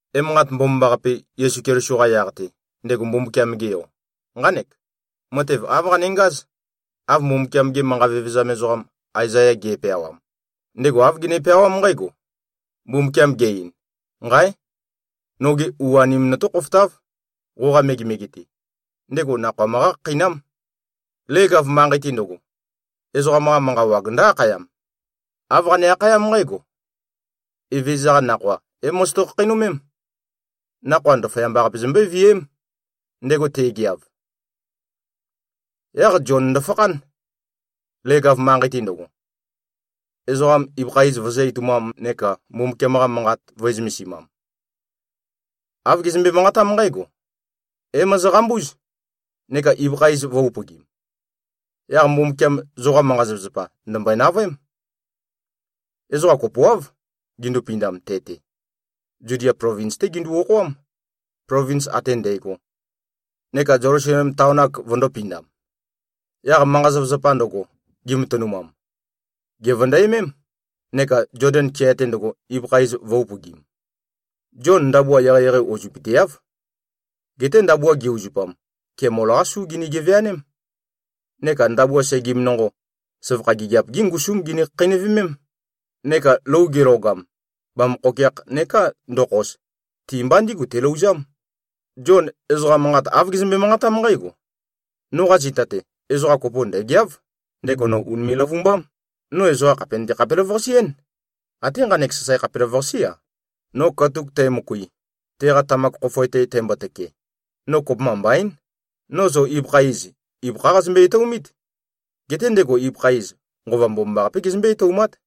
Emanqat Mbomambaqape, Yesu Keliso-qa yaq-te, ndego Mbumbukiam-ge Yo, nqánek. Matev āv qanengáz, av Mbumbukiam-ge manqa vevezam ezoqam Aezaya ge꞉peawam. Ndego āv gene-peawám nqǽgo, “Mbumbukiam ge-ein: Nqáe! Noge u-anem notó-khofotáv, qoqa megemege-te. Ndego nakhoa møqá-khakheinám. Leg-av manqei-te ndøgo, ezoqam-qa manqa wag ndǿ-akhayam. Āv qane-akhayám nqǽgo, ‘Evezøza-qa nakhoa é-mozoto-khakheinømém. Nakhoa ndaføyamba-qape zombøé-viæém, ndego te꞉geav.’” Yaq Zion ndøfakhán, leg-av manqei-te ndøgo, ezoqam ibøkha iz vøzø̄-etoumam neka Mbumbukiam-qa Manqat vø̄e-zømesimam. Āv gezømbe-manqatám nqǽgo, “É-mozoqambúz, neka ibøkha iz vø̄-upøgim. Yaq Mbumbukiam zoqa manqa-zapazapa, ndø̀mbøe-navøém.” Ezoqa kopoáv, gindupindam te-te. Zudia plovins-té gindu-okhoám, plovins ate ndægo, neka Zelusalem taon-ak vøndō-pindam. Yaq manqa-zapazapa ndøgo, gimatønumam, gèvøndæmém, neka Zoden kea-te ndøgo, ibøkha iz vø̄-upøgim. Zion ndabua eqeieqei uzøpøteáv. Geté ndabua ge-uzupam, kemol-qá su gini-geveaném, neka ndabua segim nonqo, søvakha gigiap-gí ngusúm gini-khakheinøvemém. Neka lou gelogam, bamøkhokeakh neká ndokhos, ti-mba ndígu telouzám. Zion ezoqa manqat āv gezømbe-manqatám nqǽgo, “Noqa zita-te, ezoqa kopo ndø̀geáv. Ndego no ùnime꞉-løvumbám. No ezoqa khàpe nøte-khapelavøqase-én. Até nqanek sasae khapelavøqasé-a, no katuk tæmøkui, teqa tamak khofoe-te tæmbotøke, no kopømba mbaín. No zo ibøkha iz, ibøkhá qazømbe-etoumít. Geté ndego ibøkha iz, Nqova Mbomambaqapé gezømbé-etoumát.”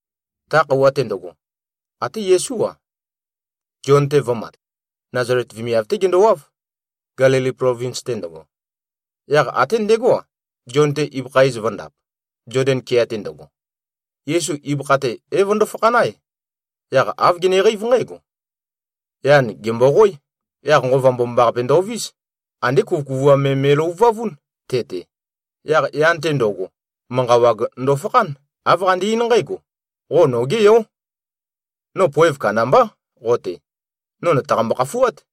Ta khøuwa-te ndøgo, até Yesú-a, Zion-te vø̄mat. Nazalet vemiav-té gendowáv, Gelili plovins-te ndøgo. Yaq até ndegó-a, Zion-te ibøkha iz vø̄ndap, Zoden kea-te ndøgo. Yesu ibøkha-te é-vøndo-fakhán-ae, yaq āv geneqeív nqǽgo: Yan gèmboqoé. Yaq Nqova Mbomambaqape ndovís. Andé kuvøkuvuam me me꞉løvuvavún, te-te. Yaq yan-te ndo꞉go, manqa wag ndofakhán. Āv qande-eín nqǽgo, “Qo nogé Yó. No poev kandambá qo-te. No nø̀taqambo-khafuát.”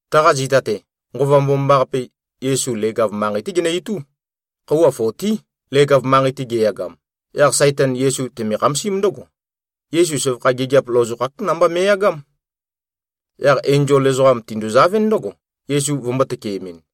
Taqa zita-te, Nqova Mbomambaqape, Yesu leg-av manqei-té genø-itú. Khøuwa fotí, leg-av manqei-te geyagam. Yaq Saitan Yesu teme-khamasím ndǿgo. Yesu søvakha gigiap lozokhák namba me꞉yagám. Yaq enzol ezoqam tinduzavɨ́n ndǿgo, Yesu vømbō-tøkeemɨn.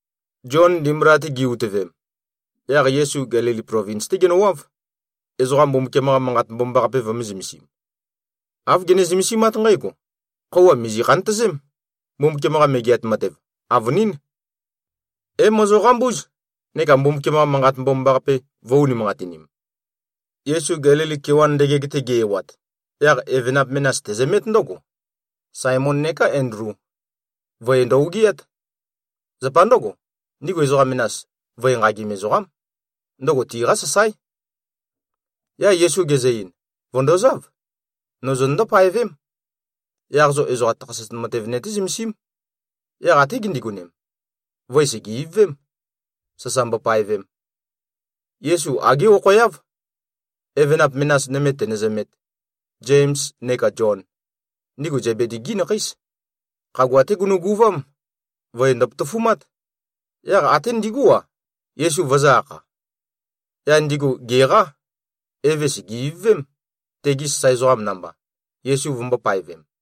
Zion ndimbula-te gi꞉-utøvem, yaq Yesu Gelili plovins-té genøwáv, ezoqa Mbumbukiam-qa Manqat Mbomambaqape vømē-zømesim. Āv gene-zømesimát nqǽgo, “Khøuwa mìzi-khantøzém. Mbumbukiam-qa Megeat Matev, avønín. É-mozoqambúz neka Mbumbukiam-qa Manqat Mbomambaqape vø̄-unimanqatinim!” Yesu Gelili kewan ndøgeg-te ge-ewat, yaq evenap menas tezømét ndǿgo, Saemon neka Endlu. Voe ndø-ogiát. Zapa ndǿgo, ndigu ezoqa menas, voe nqagim ezoqám. Ndøgo tiqá sasáe. Yaq Yesu gezø-ein, “Vø̀ndozáv. No zonøndó-paevém. Yaq zo ezoqa takhaset matev nøté-zømesím.” Yaq até gindigonem, voe sège-ivøvém, sasa mbopaevem. Yesu agé okhoeáv, evenap menas nøme tenøzømēt, Zems neka Zion. Ndigu Zebedi-gí nakheís. Khagua-té gunuguvám. Voe ndøpotofumát. Yaq ate ndigú-a, Yesu vøzø̄-akha. Yaq ndigu gèqá. Eve sège-ivøvém, tegi sasae ezoqam namba, Yesu vømbō-paevem.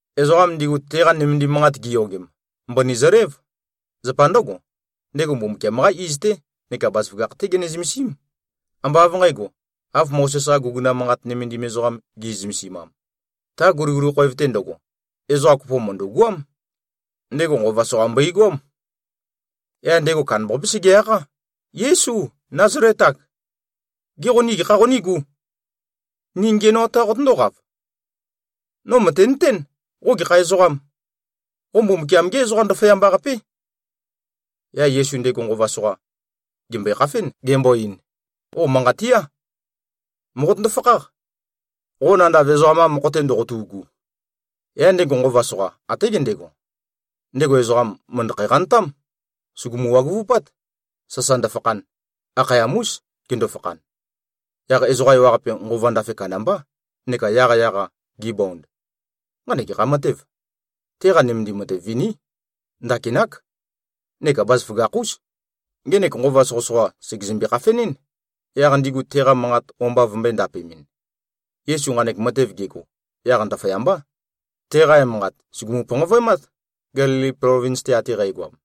Ezoqam ndigu, teqa nømendim manqat giyogem, mbøni zølév. Zapa ndǿgo, ndego Mbumbukiam-qá iz-té neka bazaføgakh-té gene-zømesím. Ambá av nqǣgo, av Mozes-qa guguna manqat nømendim ezoqam gi꞉zømesimam. Ta guliguli khoev-te ndøgo, ezoqa kopo mø̀ndu꞉goám. Ndego nqova soqa mbøigoám. Yaq ndego kandambaqapé sege-akhá, “Yésu, Názalet-ak! Gê, qo ni gekha qonígū? Ni ngiænoat-qā qotøndóqav? No mø̀tenøtén, qo gekha ezoqām. Qo Mbumbukiam-gé Ezoqa Ndaføyamba-qapé.” Yaq Yesu ndego nqova soqa, gèmbøe-khafén, gembo-ein, “Qo manqat tía! Mòqotøndo-fakháq, qo nandav ezoqam-qa mokho-te ndoqotu꞉gu.” Yaq ndego nqova soqa, até gendego, ndego ezoqam mø̀ndøkhæ-qantám, sùgumu-waguvupát, sasa ndøfakhan. Akhayam-ús, gendo-fakhan. Yaq ezoqa ewaqape, nqova ndafe kandambá, neka yaqyaq-a gibond, “Nqanek gekha matêv? Teqa nømendim matev viní. Ndakinák, neka bazaføgakh-ús. Ngenek nqova soqøsoqa sègezømbe-khafenɨ́n, yaq ndigu teqa manqat o-mba vømbø̄e-ndapemɨn.” Yesu nqanek matev gego, yaq ndaføyambá, teqa emanqat sùgumu-panqavøemát, Gelili plovins-te ate qægoam.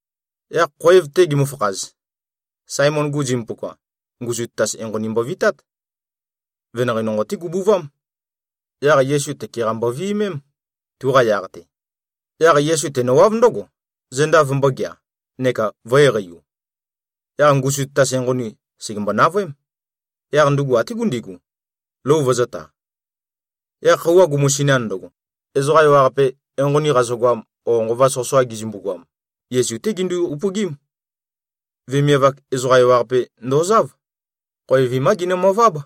Yaq khoev-te gimøfakhaz, Saemon-gu zimpuka, ngusu tatas enqoni mbovitát. Venanqei nonqo-té gubuvám. Yaq Yesu tøke-qa mboviømém, tuqa yaq-te. Yaq Yesu tenøwáv ndǿgo, zenda vømbōgea, neka vø̄-eqeiu. Yaq ngusu tatas enqoni, sègembo-navøém. Yaq ndugu até gundigu, lou vøzø̄ta. Yaq khøuwa gumusinan ndøgo, ezoqa ewaqape, enqoni qazøgoam o nqova soqøsoqa gizømbu-goam, Yesu-té gindu-upøgím. Vemiav-ak ezoqa ewaqape ndozáv. Khoev vimá ginømøváb.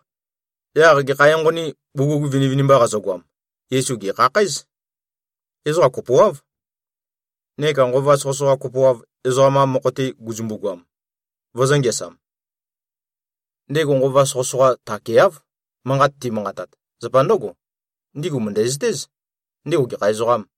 Yaq gekha enqonī, bugug vinivinimba qazøgoam, Yesu gèkhakhǽz. Ezoqa kopoáv. Neka nqova soqøsoqa kopoav, ezoqam-qa mokho-te gizømbu-goam, vøzø̄-ngeasam. Ndego nqova soqøsoqa takeáv, manqat timanqatat. Zapa ndǿgo, ndigu mø̀ndæzøtéz, ndego gekha ezoqām.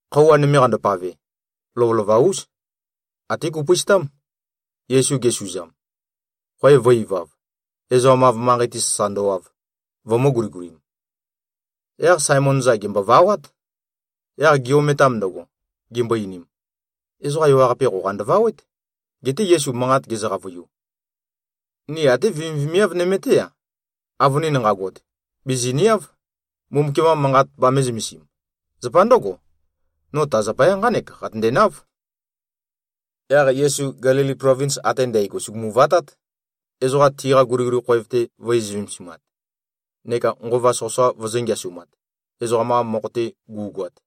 Khøuwa nøme qandopave, lovølova-ús, até gupøistám, Yesu gesùzām, khoev vø̄-ivav, ezoqam-av manqei-te sasa ndøwav, vømø̄-guligulim. Yaq Saemon-za, gèmbovawát. Yaq gi-ometam ndøgo, gimbo-einim, “Ezoqa ewaqape qoqa ndøvawét.” Geté Yesu manqat gezø-qavøiu, “Ni até vemivemiav nøme-té-a, avønin nqagot, bìziniáv, Mbumbukiam-qa Manqat bamē-zømesim. Zapa ndǿgo, no ta zapaya nqánek qatøndenáv.” Yaq Yesu Gelili plovins ate ndǽgo sugumu-vatát, ezoqa tiqa guliguli khoev-te vø̄e-zømesimat, neka nqova soqøsoqa vøzø̄-ngeasumat, ezoqam-qa mokho-te gu꞉goat.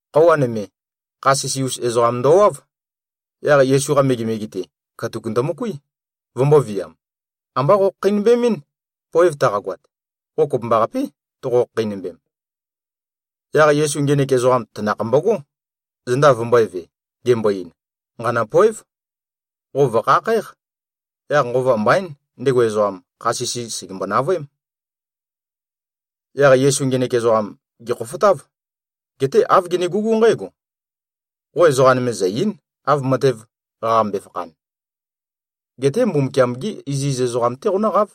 Khøuwa nøme, kha sisi-us ezoqam ndowáv. Yaq Yesu-qa megemege-te, katuk ndømøkuí, vømbōviam, “Ambá qokhakheinømbemín. Poev taqagoat, qo kopømbaqapé, toqo-khakheinømbem.” Yaq Yesu ngenek ezoqam tanakh mbogó, zenda vømbø̄eve, gembo-ein, “Nqanø̂poév. Qo vø̀khakhǽq.” Yaq nqova mbaín, ndego ezoqam, kha sisi sègembo-navøém. Yaq Yesu ngenek ezoqam gèkhofotáv. Geté āv genegugú nqǽgo, “Qo ezoqa nøme zø̀-ei᷄n, av matev qaqambe-fakhan. Geté Mbumbukiam-gé iziz ezoqam-té qonǿqáv,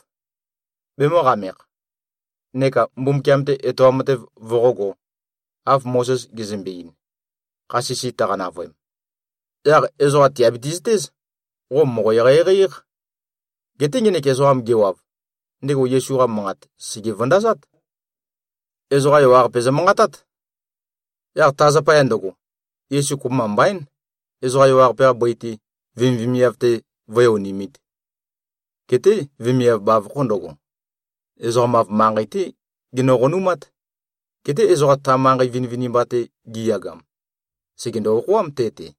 bemø̄qamekh, neka Mbumbukiam-te etoam matev voqógō, av Mozes gezømbe-ein, kha sisi tøqa-navøem. Yaq ezoqa tìabiti-zøtéz, qo mòqo-eqeieqei-éq.” Geté ngenek ezoqam gewav, ndego Yesu-qa manqat sège-vøndazát. Ezoqa ewaqape zømanqatát. Yaq ta zapaya ndøgo, Yesu kopømba mbaín, ezoqa ewaqape-qa bøi-te, vemivemiav-te vǿe-onimīt. Geté vemiav bavokho ndøgo, ezoqam-av manqei-té genø-qonumát. Geté ezoqa ta manqei vinivinimba-te giyagam, sègendo-okhoám, te-te.